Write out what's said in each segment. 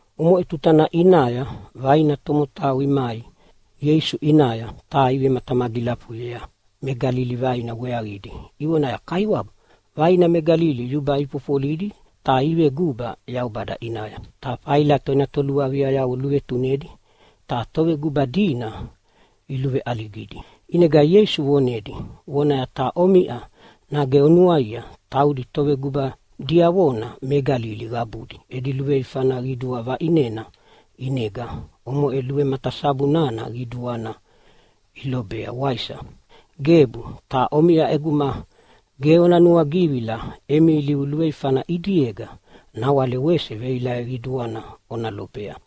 Omoʼe tutana ʼinaya vaina tomotau imai Ieisu ʼinaya, ta ivematamagilafuyea me Galili vaina weaqidi ivoneaya, “Kaiwabu, vaina me Galili yubai ifofolidi ta iveguba Yaubada ʼinaya, ta Failato ena toluaviayavo luvetunedi ta toveguba dina iluveʼaligidi.” ʼInega Ieisu vonedi vonaya, “Ta omiʼa nage onuaia taudi toveguba diavona me Galili qabudi edi luveifana qidua vaʼinena, ʼinega omoʼe luvematasabu nana qiduana ilobea, waisa? Gebu! Ta omiʼa ʼeguma ge ona nuagivila emi ilivu luveifana ʼidiega nawale wese veilaqe qiduana ona lobea.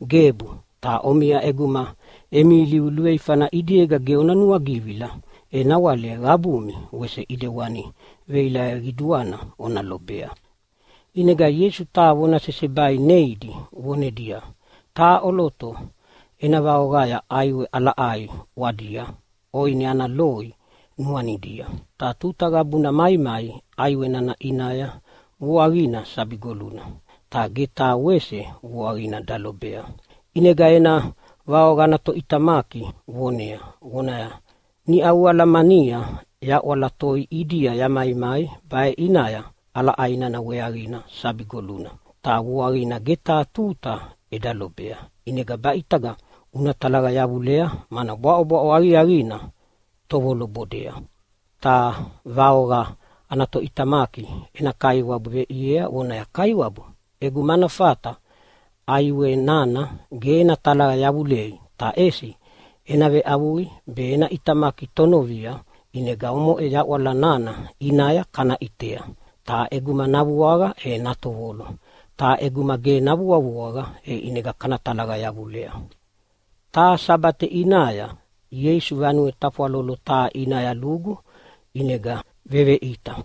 Gebu! Ta omiʼa ʼeguma emi ilivu luveifana ʼidiega ge ona nuagivila, e nawale qabumi wese ʼidewani veilaqe qiduana ona lobea.” ʼInega Ieisu taha vona sesebai neidi vonedia, “Taha ʼoloto ena vaoqaya ʼaiwe ʼalaʼai ʼwadia ʼoine ana loi nuanidia. Ta tuta qabuna maimai ʼaiwe nana ʼinaya vuaqina sabi goluna ta ge taha wese vuaqina dalobea. ʼInega ena vaoqa ana toʼitamaki vonea vonaya, ‘Niʼau ualamania yaʼwala toi ʼidia yamaimai baʼe ʼinaya ʼalaʼai nana weaqina sabi goluna, ta vuaqina ge taha tuta eda lobea. ʼInega baʼe ʼitaga una talaqa yavulea, mana bwaʼobwaʼo aqiaqina tovolo bodea.’ Ta vaoqa ana toʼitamaki ena kaiwabu veʼiea vonaya, ‘Kaiwabu, ʼeguma ana fata ʼaiwe nana ge ena talaqa yavulei, ta ʼesi ena veʼavui be ena ʼitamaki tonovia, ʼinega omoʼe yaʼwala nana ʼinaya kana ʼitea. Ta ʼeguma navuaqa e natovolo, ta ʼeguma ge navuavuaqa e ʼinega kana talaqa yavulea.’” Taha Sabate ʼinaya Ieisu vanue tafwalolo taha ʼinaya lugu ʼinega veveʼita.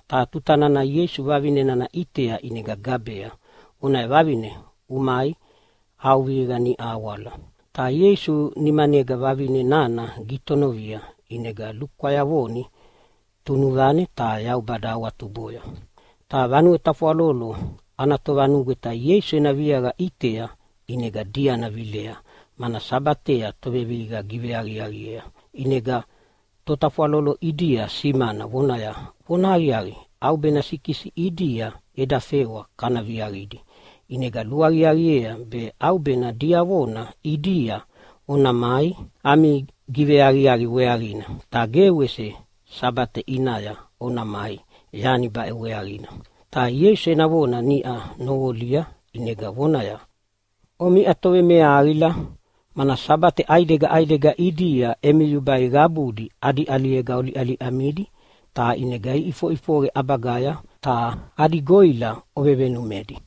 Ta tuta nana Ieisu vavine nana ʼitea ʼinega gabea vonaya, “Vavine umai, au vihiqa niʼa awala.” Ta Ieisu nimanega vavine nana gitonovia, ʼinega lukwayavoni tunuvane ta Yaubada awatuboya. Ta vanue tafwalolo ana tovanugweta Ieisu ena viaqa ʼitea, ʼinega diana vilea mana Sabatea tovevihiqa giveaqiaqiea. ʼInega totafwalolo ʼidia simana vonaya, “Vonahaqiaqi, ʼaubena sikisi ʼidia eda fewa kana viaqidi, ʼinega luaqiaqiea be ʼaubena diavona ʼidia ona mai ami giveaqiaqi weaqina, ta ge wese Sabate ʼinaya ona mai yani baʼe weaqina!” Ta Ieisu ena vona niʼau noqolia ʼinega vonaya, “Omiʼa tovemeahaqila, mana Sabate ʼaidega ʼaidega ʼidia emi yubai qabudi adi ʼaliega oliʼaliʼamidi ta ʼinega iʼifoʼifoqe ʼabagaya ta adi goʼila ovevenumedi.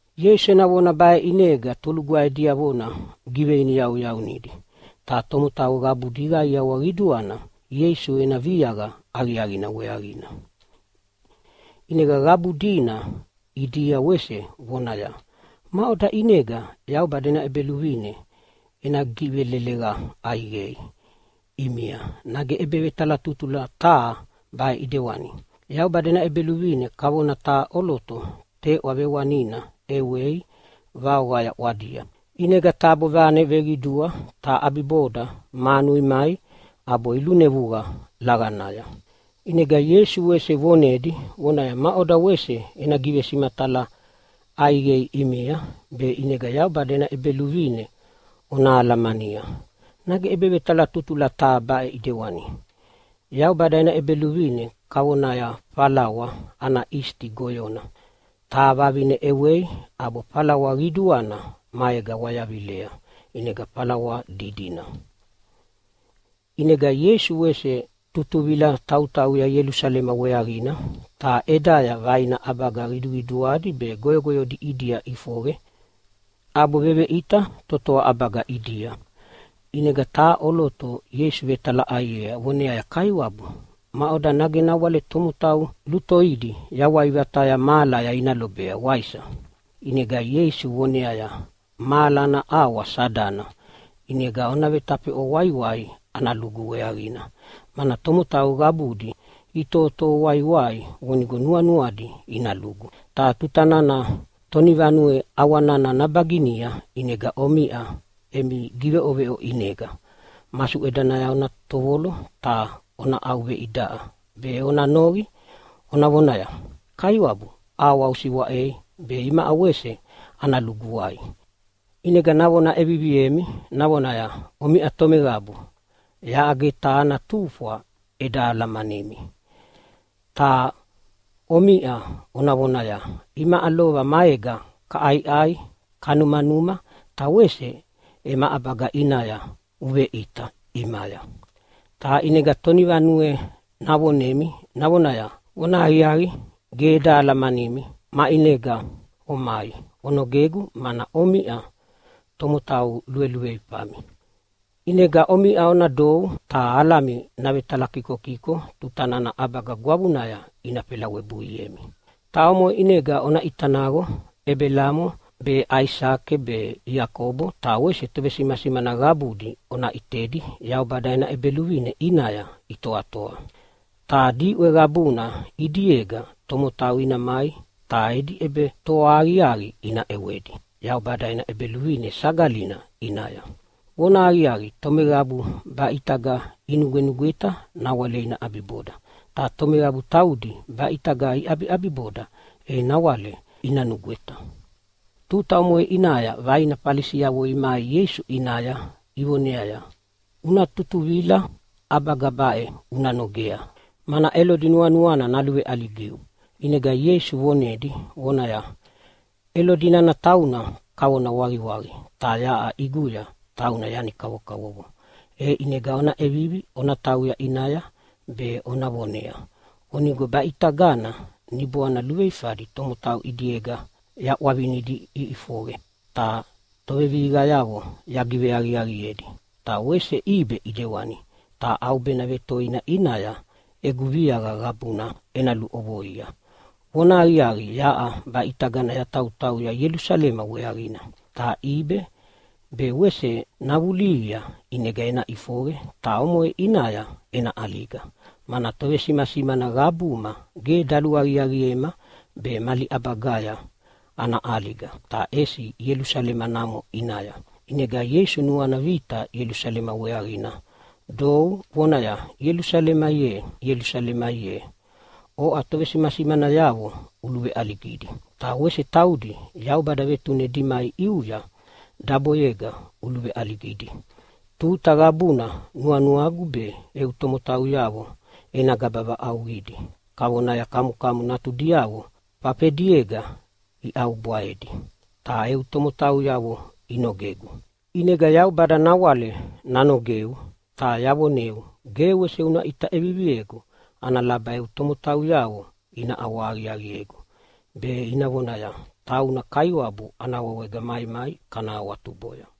Ieisu ena vona baʼe ʼinega tolugwae diavona giveiniyauyaunidi, ta tomotau qabudi iqaiawa qiduana Ieisu ena viaqa aqiaqina weaqidi. ʼInega qabu dina ʼidia wese vonaya, “Maʼoda ʼinega Yaubada ena ʼEbeluvine ena giveleleqa ʼaiqei ʼimia, nage ʼebevetalatutula taha baʼe ʼedewana: Yaubada ena ʼEbeluvine kavona taha ʼoloto teʼwa vewanina ʼewei vaoqaya ʼwadia, ʼinega tabo vane veqidua, ta ʼabiboda manu imai ʼabo ilunevuqa laqanaya.” ʼInega Ieisu wese vonedi vonaya, “Maʼoda wese ena givesimatala ʼaiqei ʼimia be ʼinega Yaubada ena ʼEbeluvine ona alamania, nage ʼebevetalatutula taha baʼe ʼedewana: Yaubada ena ʼEbeluvine kavonaya falawa ana isiti goyona taha vavine ʼewei ʼabo falawa qiduana maega wayavilea ʼinega falawa didina.” ʼInega Ieisu wese tutuvila tautauya Ielusalema weaqina, ta ʼedaya vaina ʼabaga qiduqiduadi be goyogoyodi ʼidia ʼifoqe, ʼabo veveʼita totoa ʼabaga ʼidia. ʼInega taha ʼoloto Ieisu vetalaʼaiea voneaya, “Kaiwabu maʼoda, nage nawale tomotau lutoidi yawai vataya mahalaya ina lobea, waisa?” ʼInega Ieisu voneaya, “Mahala ana ʼawa sadana. ʼInega ona vetafeʼwa waiwai ana lugu weaqina, mana tomotau qabudi itohotoho waiwai vonigo nuanuadi ina lugu. Ta tuta nana tonivanue ʼawa nana nabaginia ʼinega omiʼa emi giveʼoveʼo ʼinega masuʼedanaya ona tovolo ta ona ʼauveidaʼa be ona noqi ona vonaya, ‘Kaiwabu, ʼawa usiwaʼei be imaʼa wese ana lugu wai.’ ʼInega navona ʼeviviemi navonaya, ‘Omiʼa tomeqabu? Yaʼa ge taha ana tufwa eda alamanimi!’ Ta omiʼa ona voneaya, ‘Imaʼa lova maega kaʼaiʼai kanumanuma, ta wese ema ʼabaga ʼinaya uveʼita ʼimaya.’ Ta ʼinega tonivanue navonemi navonaya, ‘Vonahaqiaqi, ge eda alamanimi, maʼinega omai? Onogegu, mana omiʼa tomotau luveluveifami!’ “ʼInega omiʼa ona dou ta alami navetalakikokiko tuta nana ʼabaga gwavunaya ina felawebuiemi. Ta omoʼe ʼinega ona ʼita naqo Ebelamo be, Aisake be, Iakobo ta wese tovesimasimana qabudi ona ʼitedi Yaubada ena ʼEbeluvine ʼinaya itoatoa. Ta diʼwe qabuna ʼidiega tomotau ina mai ta edi ʼebetoa aqiaqidi ina ʼewedi Yaubada ena ʼEbeluvine sagalina ʼinaya. Vonahaqiaqi, tomeqabu baʼe ʼitaga inugwenugweta nawale ina ʼabiboda, ta tomeqabu taudi baʼe ʼitaga iʼabiʼabiboda, e nawale ina nugweta.” Tuta omoʼe ʼinaya vaina Falisiavo imai Ieisu ʼinaya ivoneaya, “Una tutuvila ʼabaga baʼe una nogea, mana Elodi nuanuana naluveʼaligiu.” ʼInega Ieisu vonedi vonaya, “Elodi nana tauna kavona waqiwaqi, ta yaʼa ʼiguya tauna yani kavokavovo, e ʼinega ona ʼevivi ona tauya ʼinaya be ona vonea vonigo baʼitagana niboana luveifadi tomotau ʼidiega yaʼwavinidi iʼifoqe ta tovevihiqayavo yagiveaqiaqiedi, ta wese ʼibe ʼedewani, ta ʼaubena vetoina ʼinaya egu viaqa qabuna ena luʼovoia. Vonahaqiaqi, yaʼa baʼitagana yatautauya Ielusalema weaqina, ta ʼibe be wese navulihia ʼinega ena ʼifoqe, ta omoʼe ʼinaya ena ʼaliga, mana tovesimasimana qabuma ge daluaqiaqiema be mali ʼabagaya ana ʼaliga, ta ʼesi Ielusalema namo ʼinaya.” ʼInega Ieisu nuana vita Ielusalema weaqina dou vonaya, “Ielusalema ye, Ielusalema ye! Oʼa tovesimasimanayavo uluveʼaligidi, ta wese taudi Yaubada vetunedi imai ʼiuya daboyega uluveʼaligidi. Tuta qabuna nuanuagu be eu tomotauyavo ena gaba vaʼauqidi kavonaya kamukamu natudiavo fafediega iʼaubwaedi, ta eu tomotauyavo inogegu. ʼInega Yaubada nawale nanogeu ta yavoneu ge wese una ʼita ʼeviviegu ana laba eu tomotauyavo ina ʼawahaqiaqiegu be ina vonaya, ‘Tauna Kaiwabu ana wawega maimai kana awatuboya.’”